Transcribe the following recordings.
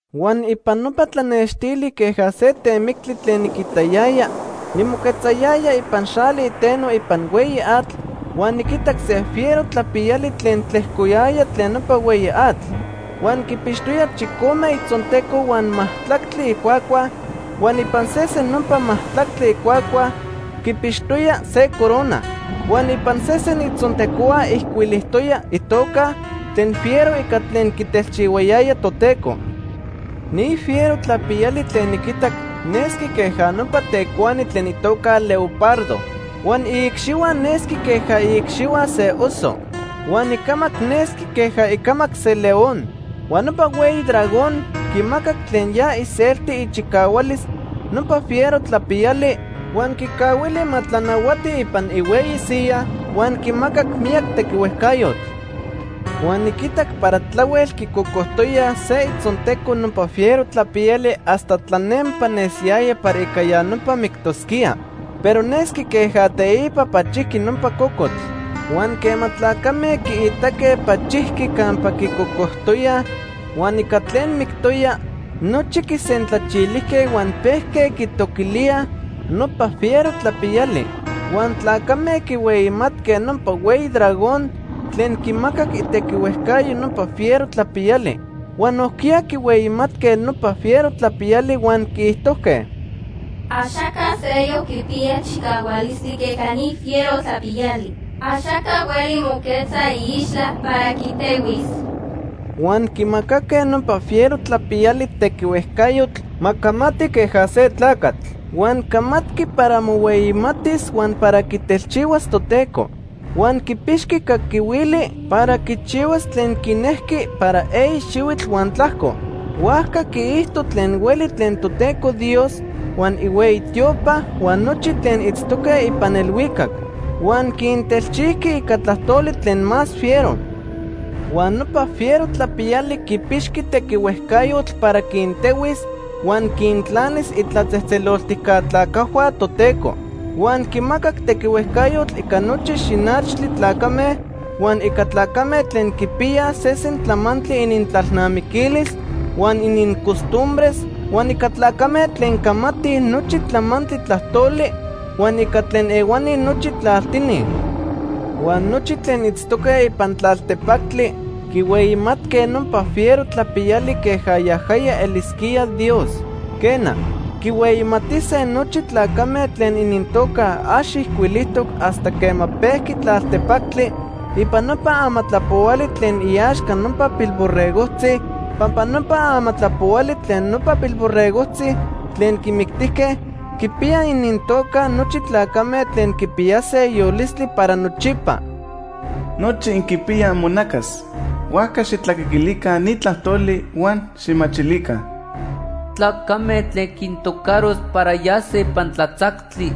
Huan ipan nopa tlanextili queja se temictli tlen niquitayaya, nimoquetzayaya ipan xali iteno ipan hueyi atl huan niquitac se fiero tlapiyali tlen tlejcoyaya tlen nopa hueyi atl. Huan quipixtoya chicome itzonteco huan majtlactli icuacua huan ipan sesen nopa majtlactli icuacua quipixtoya se corona. Huan ipan sesen itzontecohua ijcuilijtoya itoca tlen fiero ica tlen quitelchihuayaya Toteco. Ni fiero tlapiyali tlen niquitac nesqui queja nopa tecuani tlen itoca leopardo. Huan iicxihua nesqui queja iicxihua se oso, huan icamac nesqui queja icamac se león. Huan nopa hueyi dragón quimacac tlen ya iselti ichicahualis nopa fiero tlapiyali, huan quicahuili ma tlanahuati ipan ihueyi siyaj huan quimacac miyac tequihuejcayotl. Huan niquitac para tlahuel quicocojtoyaj se itzonteco nopa fiero tlapiyali hasta tlanempa nesiyaya para ica ya nopa mictosquía. Pero nesqui queja teipa pachijqui nopa cocotl. Huan quema tlacame quiitaque pachijqui campa quicocojtoyaj huan ica tlen mictoya, nochi quisentlachilijque huan pejque quitoquilíaj nopa fiero tlapiyali. Huan tlacame quihueyimatque nopa hueyi dragón tlen quimacac itequihuejcayo nopa fiero tlapiyali. Huan nojquiya quihueyimatque nopa fiero tlapiyali huan quiijtojque: “Axaca seyoc quipiya chicahualistli queja ni fiero tlapiyali. Axaca hueli moquetza iixtla para quitehuis.” Huan quimacaque nopa fiero tlapiyali tequihuejcayotl ma camati queja se tlacatl. Huan camatqui para mohueyimatis huan para quitelchihuas Toteco. Huan quipixqui caquihuili para quichihuas tlen quinejqui para eyi xihuitl huan tlajco. Huajca quiijto tlen hueli tlen Toteco Dios, huan ihueyi tiopa huan nochi tlen itztoque ipan elhuicac. Huan quintelchijqui ica tlajtoli tlen más fiero. Huan nopa fiero tlapiyali quipixqui tequihuejcayotl para quintehuis huan quintlanis itlatzejtzeloltijca tlacajhua Toteco. Huan quimacac tequihuejcayotl ica nochi xinachtli tlacame, huan ica tlacame tlen quipiyaj sesen tlamantli inintlalnamiquilis huan inincostumbres, huan ica tlacame tlen camatij nochi tlamantli tlajtoli huan ica tlen ehuani nochi tlaltini. Huan nochi tlen itztoque ipan tlaltepactli quihueyimatque nopa fiero tlapiyali queja yajaya elisquía Dios. Quena, quihueyimatise nochi tlacame tlen inintoca ax ijcuilijtoc hasta quema pejqui tlaltepactli ipan nopa amatlapohuali tlen iaxca nopa Pilborregojtzi, pampa nopa Amatlapohuali Tlen Nopa Pilborregojtzi Tlen Quimictijque quipiya inintoca nochi tlacame tlen quipiyase yolistli para nochipa. Nochi inquipiyaj imonacas, huajca xijtlacaquilica ni tlajtoli huan xijmachilica: “Tlacame tlen quintocaros para yase ipan tlatzactli,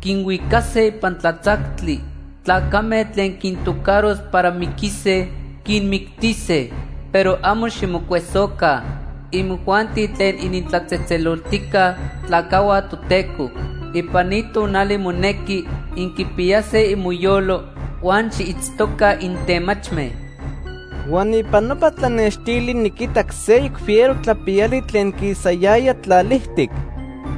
quinhuicase ipan tlatzactli. Tlacame tlen quintocaros para miquise, quinmictise. Pero amo ximocuesoca, imojuanti tlen initlatzejtzeloltijca tlacajhua Toteco. Ipan ni tonali monequi inquipiyase imoyolo huan xiitztoca intemachme.” Huan ipan nopa tlanextili niquitac seyoc fiero tlapiyali tlen quisayaya tlalijtic.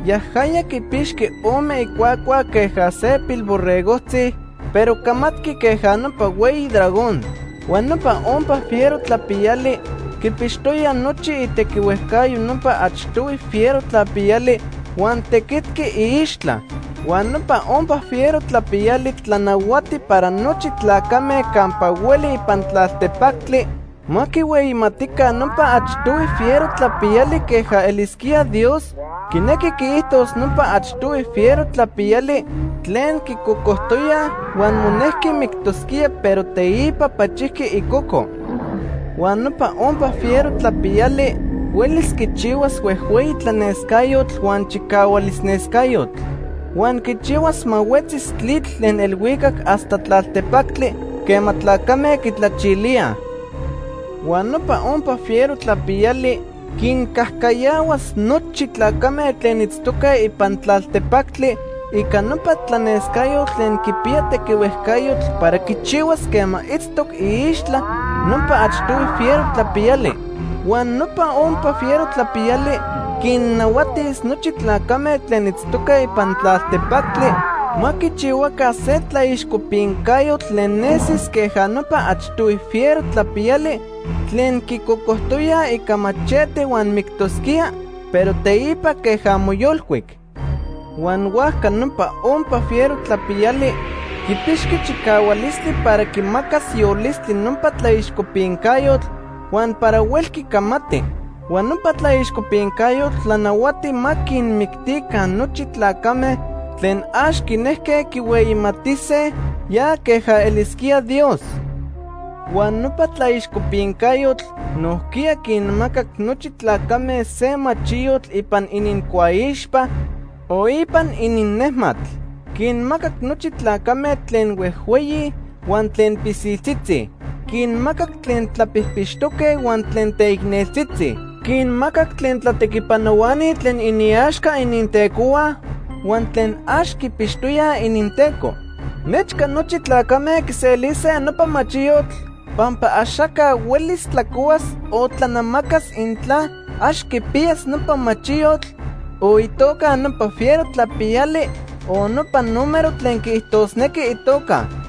Yajaya quipixqui ome icuacua queja se pilborregojtzi, pero camatqui queja nopa hueyi dragón. Huan nopa ompa fiero tlapiyali quipixtoya nochi itequihuejcayo nopa achtohui fiero tlapiyali huan tequitic iixtla. Huan nopa ompa fiero tlapiyali tlanahuati para nochi tlacame campa hueli ipan tlaltepactli ma quihueyimatica nopa achtohui fiero tlapiyali queja elisquía Dios, quinequi quiijtos nopa achtohui fiero tlapiyali tlen quicocojtoyaj huan monejqui mictosquía, pero teipa pachijqui icoco. Huan nopa ompa fiero tlapiyali huelis quichihuas huejhueyi tlanescayotl huan chicahualis nescayotl. Huan quichihuas ma huetzis tlitl tlen elhuicac hasta tlaltepactli quema tlacame quitlachilíaj. Huan nopa ompa fiero tlapiyali quincajcayahuas nochi tlacame tlen itztoque ipan tlaltepactli ica nopa tlanescayotl tlen quipiya tequihuejcayotl para quichihuas quema itztoc iixtla nopa achtohui fiero tlapiyali. Huan nopa ompa fiero tlapiyali quinnahuatis nochi tlacame tlen itztoque ipan tlaltepactli ma quichihuaca se tlaixcopincayotl tlen nesis queja nopa achtohui fiero tlapiyali tlen quicocojtoyaj ica machete huan mictosquía, pero teipa queja moyolcuic. Huan huajca nopa ompa fiero tlapiyali quipixqui chicahualistli para quimacas yolistli nopa tlaixcopincayotl huan para huelqui camati. Huan nopa tlaixcopincayotl tlanahuati ma quinmictica nochi tlacame tlen ax quinejque quihueyimatise ya queja elisquía Dios. Huan nopa tlaixcopincayotl nojquiya quinmacac nochi tlacame se machiyotl ipan inincuaixpa o ipan ininnejmatl. Quinmacac nochi tlacame tlen huejhueyi huan tlen pilsiltzitzi. Quinmacac tlen tlapijpixtoque huan tlen teicneltzitzi. Quinmacac tlen tlatequipanohuani tlen iniaxca inintecohua huan tlen ax quipixtoyaj ininteco. Nechca nochi tlacame quiselise nopa machiyotl, pampa axaca huelis tlacohuas o tlanamacas intla ax quipiyas nopa machiyotl, o itoca nopa fiero tlapiyali o nopa número tlen quiijtosnequi itoca.